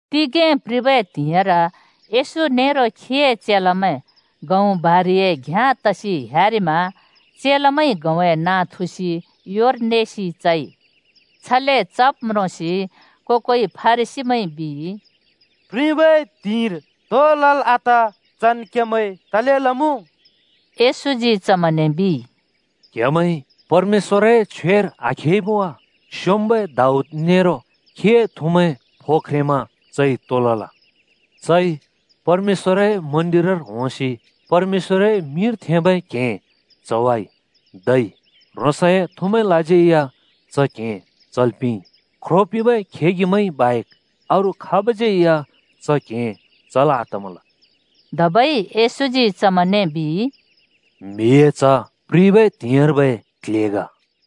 तिगें प्रिबै त्हिंइर येशू नेरो खीए चेलामैं गहुँ बारिए घ्‍याँ तसि ह्‍यारिमा चेलामैंइ गहुँए नाँ थुसि योर नेसि चइ। छले चब् म्रोंसि को-कोइ फरिसीमैंइ बिइ, “प्रिबै त्हिंइर तो लल् आत चन् क्हेमैंइ तले लमुँ?” येशूजी चमैंने बिइ, “क्‍हेमैंइ परमेश्‍वरए छ्वेर आखेइमुँ वा? स्‍योंम्‍बै दाऊद नेरो खीए थुमैं फो ख्रेंमा चइ तो लल? चइ परमेश्‍वरए मन्दिरर होंसि परमेश्‍वरए मिंर थेंबै क्हें चवाइ। धै ह्रोंसए थुमैंलाज्यै या च क्‍हें चल् पिंइ। ख्रो पिंबै खेगिमैंइ बाहेक अरू खाबज्‍यै या च क्हें चल् आतमल।” धबै येशूजी चमैंने बिइ, “म्हिए च्ह प्रिबै त्हिंइर्बै क्‍ल्‍हे ग।”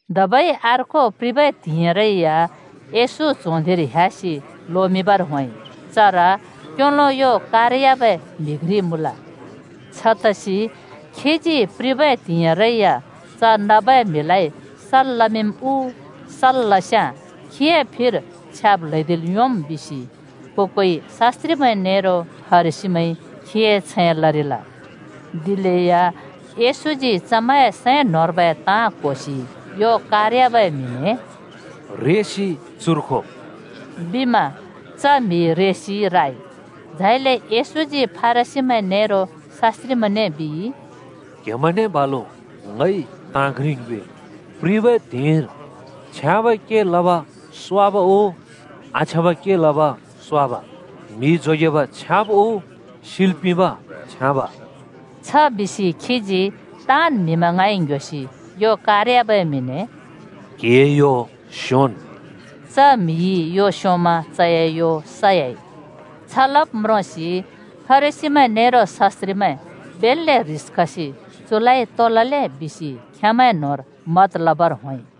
धबै अर्को प्रिबै त्हिंइरै या येशू च्हों धिंर ह्‍यासि लोमिंबर होंइ। चर क्‍योलो यो कार‍याबै म्हि घ्रि मुँल। छतसि खीजी प्रिबै त्हिंइरै या च नबै म्हिलाइ सल् लमिंम् उ सल् लस्याँ खीए फिर छ्याब् ल्‍हैदिल् योंम् बिसि को-कोइ शास्‍त्रिमैं नेरो फरिसीमैंइ खीए छैं लरिल। दिलेया येशूजी चमैंए सैं न्‍होंर्बै ताँ क्‍होसि यो कार‍याबै म्हिने “रेसि चुर खो,” बिमा च म्हि रेसि राइ। झाइले येशूजी फरिसीमैं नेरो शास्‍त्रिमैंने बिइ, “क्‍हेमैंने बालु ङइ ताँ घ्रि ङ्योएम्! प्रिबै त्हिंइर छ्याँबै के लब स्वाब उ आछ्याँबै के लब स्वाब? म्‍हि जोगेब छ्याँब उ सिल् पिंब छ्याँब?” छ बिसि खीजी ताँन् म्‍हिमैं ङाँइ ङ्ह्‍योसि यो कारयाबै म्हिने “क्‍हिए यो स्‍योंन्,” बिइ। च म्‍हिइ यो स्योंमा चए यो सयाइ। छ लब् म्रोंसि फरिसीमैं नेरो शास्‍त्रिमैं बेल्‍ले ह्रिस खसि चुलाइ तो लले बिसि खेमैं न्‍होंर मत लबर होंइ।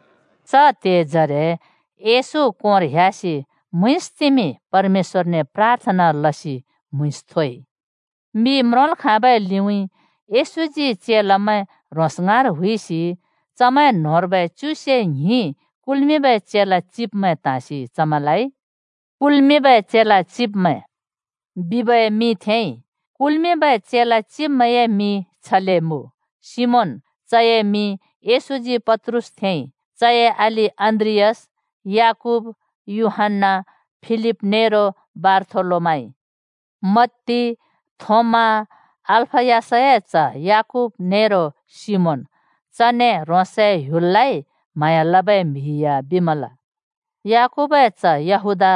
च त्‍हेजरे येशू कोंर ह्‍यासि म्‍हुँइँसतिमि परमेश्‍वरने प्राथना लसि म्हुँइँस थोइ। मि म्रोंल् खाँबै लिउँइँ येशूजी चेलामैं ह्रोंस ङाँर हुइसि चमैं न्‍होंर्बै च्युसे ङ्हिं कुल्मिंबै चेला चिब्मैं त्‍हाँसि चमैंलाइ “कुल्मिंबै चेला चिब्मैं” बिबै मिं थेंइ। कुल्मिंबै चेला चिब्मैंए मिं छले मुँ: सिमोन (चए मिं येशूजी पत्रुस थेंइ) चए अलि अन्‍द्रियास, याकूब, यूहन्‍ना, फिलिप नेरो बारथोलोमाइ, मत्ती, थोमा, अल्‍फयसए च्‍ह याकूब नेरो सिमोन, (चने “ह्रोंसए ह्‍युललाइ म्‍हाँया लबै म्हि या” बिमल)। याकूबए च्‍ह यहूदा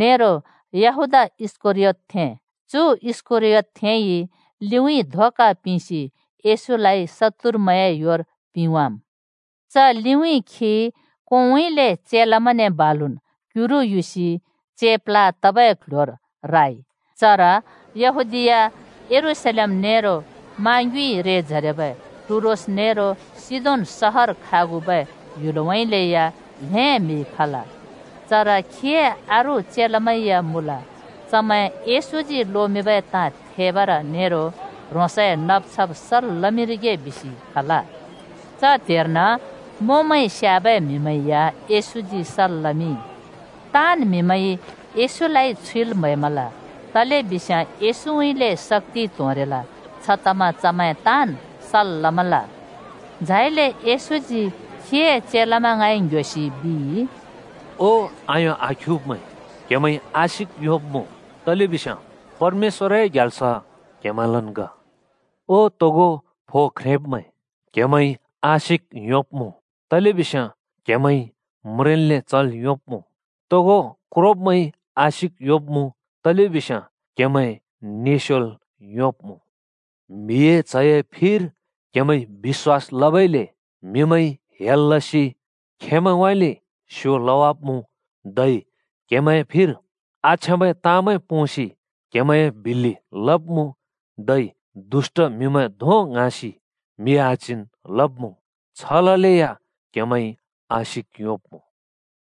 नेरो यहूदा इस्‍करयोतथें (चु इस्‍करियोतथेंइ लिउँइँ धोका पिंसि येशूलाइ शत्तुरमैंए योर पिंवाम्। च लिउँइँ खी कोंउँइँले चेलामैंने बालुन् क्युरु युसि चेप्ला तबै क्‍ल्‍ह्‍योर राइ। चर यहूदीया, यरूशलेम नेरो मा ङ्युँइ रेजरेबै टुरोस नेरो सिदोन सहर खागुबै ह्‍युलउँइँले या ल्हें म्हि खल। चर खीए अरू चेलामैं या मुँल। चमैं येशूजी लोमिंबै ताँ थेबर नेरो ह्रोंसए नब्-छब् सल् लमिंरिगे बिसि खल। च त्‍हेर्न मोंमैंइ स्‍याबै म्हिमैं या येशूजी सल् लमिंइ। ताँन् म्‍हिमैंइ येशूलाइ छुइल् म्‍हैमल, तलेबिस्याँ येशूउँइँले शक्‍ति त्होंरिल। छतमा चमैं ताँन् सल् लमल। झाइले येशूजी खीए चेलामैं ङाँइ ङ्‌ह्‍योसि बिइ, “ओ आयों आख्युब्मैं, क्हेमैंइ आशिक योंब्मुँ तलेबिस्याँ परमेश्‍वरए ग्याल्स क्हेमैंलन् ग। ओ तोगो फो ख्रेंब्मैं, क्हेमैंइ आशिक योंब्मुँ तलेबिस्याँ क्‍हेमैंइ म्रेंन्ले चल् योंब्‍मुँ। तोगो क्रोब्‍मैंइ आशिक योंब्मुँ, तलेबिस्याँ क्‍हेमैं निस्‍योल् योंब्‍मुँ। “म्हिए च्हए फिर क्‍हेमैंइ बिश्‍वास लबइले म्‍हिमैंइ हेल लसि खेंमैंउँइँले स्यो लावाब्मुँ, धै क्हेमैं फिर आछ्याँबै ताँमैं पोंसि क्हेमैंए बिल्‍लि लब्मुँ, धै दुष्‍ट म्हिमैं धों ङ्हाँसि म्हि आच्हिन् लब्मुँ। छ ललेया क्हेमैंइ आशिक योंब्मुँ।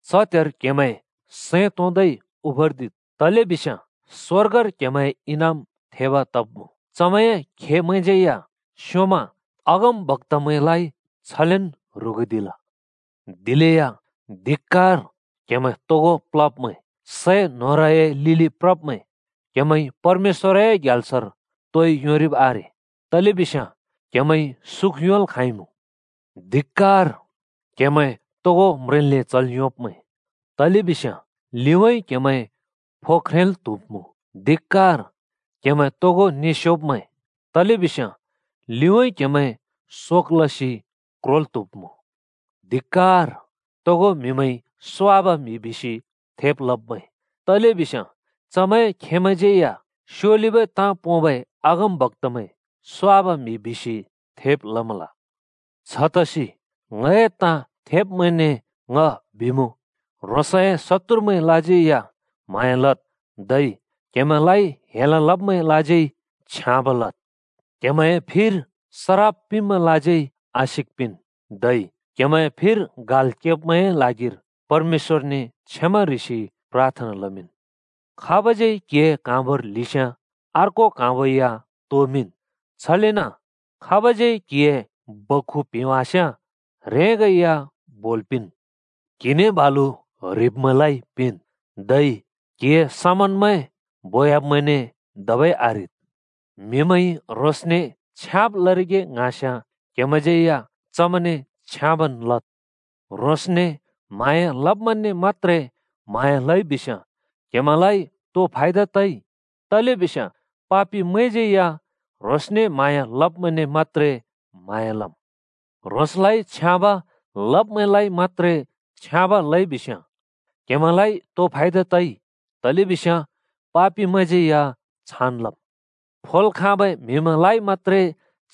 च त्‍हेर क्‍हेमैं सैं तोंदै उफरदिद्, तलेबिस्याँ स्‍वर्गर क्‍हेमैंए इनाम थेब तब्मुँ। चमैंए खेमैंज्‍यै या स्‍योंमा अगमबक्‍तामैंलाइ छलेन् ह्रुगुदिल। दिलेया धिक्‍कार क्हेमैं तोगो प्लब्‍मैं! सै न्होरए लिलि प्रब्‍मैं क्हेमैंइ परमेश्‍वरए ग्याल्सर तोइ योंरिब् आरे। तलेबिस्याँ क्‍हेमैंइ सुख योंल् खाँइमुँ। धिक्‍कार, क्‍हेमैं तोगो म्रेंन्ले चल् योंब्मैं! तलेबिस्याँ लिउँइँ क्‍हेमैं फो ख्रेंल् त्हुब्‍मुँ। धिक्‍कार, क्‍हेमैं तोगो निस्‍योब्‍मैं! तलेबिस्याँ लिउँइँ क्‍हेमैं शोक लसि क्रोल् त्हुब्‍मुँ। धिक्‍कर, तोगो म्‍हिमैंइ स्वाब म्हि बिसि थेब् लब्मैं! तलेबिस्याँ चमैंए खेमैंज्यैया स्योलिबै ताँ पोंबै अगमबक्‍तामैं स्वाब म्हि बिसि थेब् लमल। “छतसि ङए ताँ थेब्‍मैंने ङ बिमुँ, ह्रोंसए शत्तुरमैंलाज्यै या म्‍हाँया लद्, धै क्‍हेमैंलाइ हेल लब्‍मैंलाज्यै छ्याँब लद्। क्‍हेमैंए फिर सराप पिंब्‍मैंलाज्यै आशिक पिंन्, धै क्‍हेमैंए फिर गाल् केब्‍मैंए ल्हागिर परमेश्‍वरने क्षमा ह्रिसि प्राथना लमिंन्। खाबज्यै क्हिए क्‍हाँबोर ल्हिस्याँ अर्को क्‍हाँबो या तोमिंन्, छलेन खाबज्यै क्‍हिए बक्‍खु प्हेंवास्‍याँ ह्रेंगै या बोल् पिंन्। क्‍हिने बालु ह्रिब्मैंलाइ पिंन्, धै क्‍हिए समनमैं बोयाब्मैंने धबै आह्रिद्। “म्हिमैंइ ह्रोंसने छ्याँब् लरिगे ङ्हाँस्याँ क्हेमैंज्यै या चमैंने छ्याँबन् लद्। ह्रोंसने म्‍हाँया लब्‍मैंने मत्‍त्रे म्‍हाँया लइ बिस्‍याँ क्‍हेमैंलाइ तो फयादा तइ? तलेबिस्याँ पापिमैंज्यै या ह्रोंसने म्हाँया लब्मैंने मत्‍त्रे म्हाँया लम्। ह्रोंसलाइ छ्याँब लब्मैंलाइ मत्‍त्रे छ्याँब लइ बिस्‍याँ, क्‍हेमैंलाइ तो फयाद तइ? तलेबिस्याँ पापिमैंज्यै या छान् लम्। फोल् खाँबै म्हिमैंलाइ मत्‍त्रे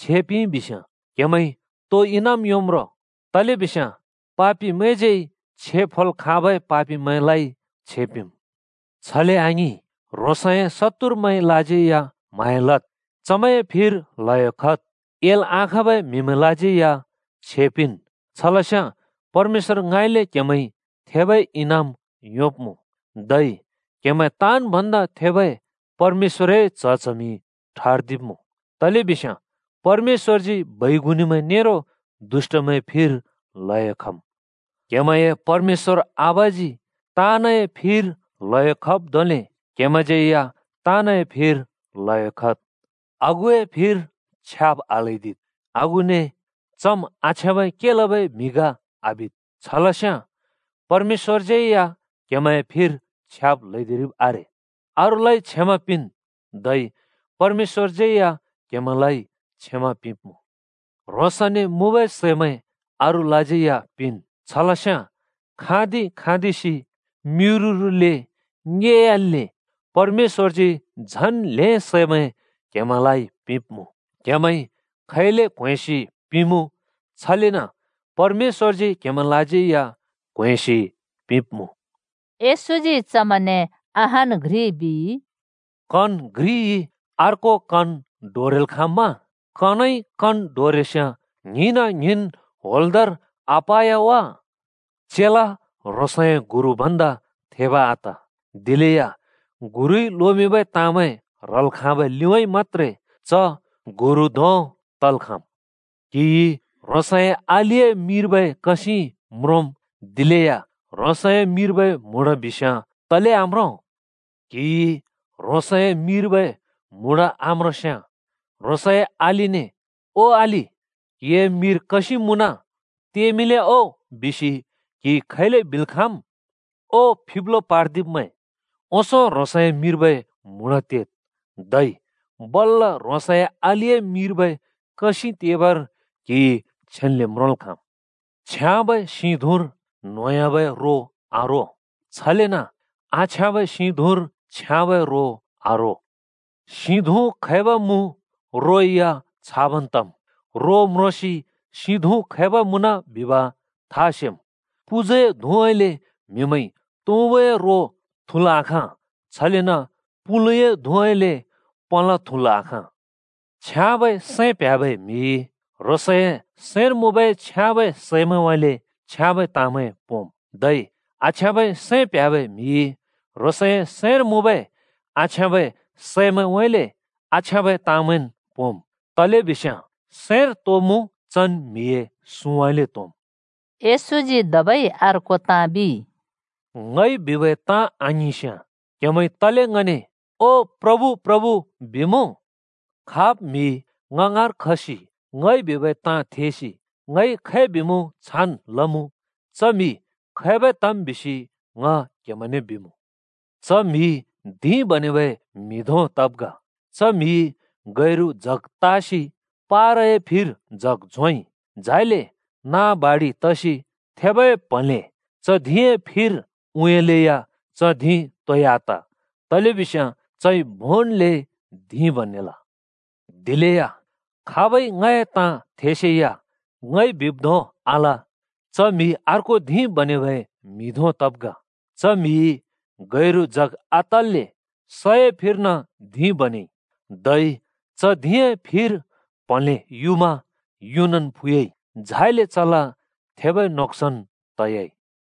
छे पिंइ बिस्याँ, क्‍हेमैंइ तो इनाम योंम् रो? तलेबिस्याँ पापिमैंज्यै छे फोल् खाँबै पापिमैंलाइ छे पिंम्। छले आङिं, ह्रोंसए शत्तुरमैंलाज्यै या म्‍हाँया लद्, चमैंए फिर ल्हयो खद्, एल् आखाँबै म्‍हिमैंलाज्यै या छे पिंन्। छलस्याँ परमेश्‍वरङाँइँले क्‍हेमैंइ थेबै इनाम योंब्‍मुँ। धै क्‍हेमैं ताँन् भन्दा थेबै परमेश्‍वरए च्ह-च्हमि ठर्दिब्‍मुँ, तलेबिस्याँ परमेश्‍वरजी बैगुनिमैं नेरो दुष्‍टमैं फिर ल्हयो खम्। क्‍हेमैंए परमेश्‍वर आबाजी ताँनए फिर ल्हयो खब् धोंले क्‍हेमैंज्यै या ताँनए फिर ल्हयो खद्। “आगुए फिर छ्याब् आल्‍हैदिद्, आगुने चम् आछ्याँबै के लबै म्हि ग आबिद्। छलस्याँ परमेश्‍वरज्यै या क्‍हेमैंए फिर छ्याब् ल्हैदिरिब् आरे। अरूलाइ क्षमा पिंन्, धै परमेश्‍वरज्यै या क्‍हेमैंलाइ क्षमा पिंब्मुँ। ह्रोंसने मुँबै सैमैं अरूलाज्यै या पिंन् छलस्याँ खाँदि-खाँदिसि, म्‍युरुरुले ङेयाल्‍ले परमेश्‍वरजी झन् ल्हें सैमैं क्हेमैंलाइ पिंब्‍मुँ। क्‍हेमैंइ खैले क्‍होंएँसि पिमुँ, छलेन परमेश्‍वरजी क्‍हेमैंलाज्यै या क्हों‍एँसि पिंब्‍मुँ।” येशूजी चमैंने अहान् घ्रि बिइ, “कन घ्रिइ अर्को कन डोरेल् खाँम्‍मा? कनइ कन डोरेस्याँ ङ्हिंना ङ्हिंन् होंल्‍दोंर आपा‍य वा? चेला ह्रोंसए गुरु भन्दा थेब आत, दिलेया गुरुइ लोमिंबै ताँमैं ह्रल् खाँबै लिउँइँ मत्‍त्रे च गुरु धोंब तल् खाँम्। “क्‍हिइ ह्रोंसए अलिए मिर्बै कसिं म्रोंम्, दिलेया ह्रोंसए मिर्बै म्हुँडा बिस्‍याँ तले आम्रों? क्हिइ ह्रोंसए मिर्बै म्हुँडा आम्रोंस्याँ, ह्रोंसए अलिने ‘ओ अलि क्‍हिए मिर कसिं मुँन तेमिंले ओ,’ बिसि क्‍हिइ खैले बिल् खाँम्? ओ फिब्लो पार्दिब्मैं! ओंसों ह्रोंसए मिर्बै म्हुँडा तेद्, धै बल्‍ल ह्रोंसए अलिए मिर्बै कसिं तेबर क्‍हिइ छेन्‍ले म्रोंल् खाँम्। “छ्याँबै सिं धुँर न्‍होंह्‍याबै रो आरो। छलेन आछ्याँबै सिं धुँर छ्याँबै रो आरो। सिं धुँ खैब मुँ, रो या छाबन् तम्। रो म्रोंसि सिं धुँ खैब मुँन बिब था सेम्। पुजुए धुँउँइँले म्‍हिमैंइ तुँबुए रो थुल् आखाँ, छलेन पुलुए धुँउँइँले पलाँ थुल् आखाँ। छ्याँबै सैं प्ह्‍याबै म्‍हिइ ह्रोंसए सैंर मुँबै छ्याँबै सैमैंउँइँले छयाँबै ताँमैं पोंम्, धै आछ्याँबै सैं प्ह्‍याबै म्‍हिइ ह्रोंसए सैंर मुँबै आछ्याँबै सैंउँइँले आछ्याँबै ताँमैंन् पोंम्। तलेबिस्याँ सैंर तो मुँ चन् म्‍हिए सुँउँइँले त्‍होंम्।” येशूजी धबै अर्को ताँ बिइ, “ङइ बिबै ताँ आङिंस्‍याँ क्‍हेमैंइ तले ङने ‘ओ प्रभु, प्रभु’ बिमुँ? खाब् म्‍हि ङ ङाँर खसि ङइ बिबै ताँ थेसि ङइ खै बिमुँ छान् लमुँ, च म्हि खैबै तम् बिसि ङ क्‍हेमैंने बिमुँ: च म्‍हि धिं बनेबै म्‍हि धों तब् ग। च म्‍हिइ गैरु जग त्‍हासि पारए फिर जग झोंइ। झाइले नाँ बाडि तसि थेबै प्हँले च धिंए फिर उँयालेया च धिं तोइ आत, तलेबिस्याँ चइ भोंन्‍ले धिं बनेल। दिलेया खाबइ ङए ताँ थेसेया ङइ बिब् धों आल, च म्‍हि अर्को धिं बनेबै म्‍हि धों तब् ग। च म्‍हिइ गैरु जग आतल्‍ले सए फिर्न धिं बनेइ। धै च धिंए फिर प्हँले युमा युनन् फु‍याम्। झाइले चला थेबै नोक्सन् त‍याइ।”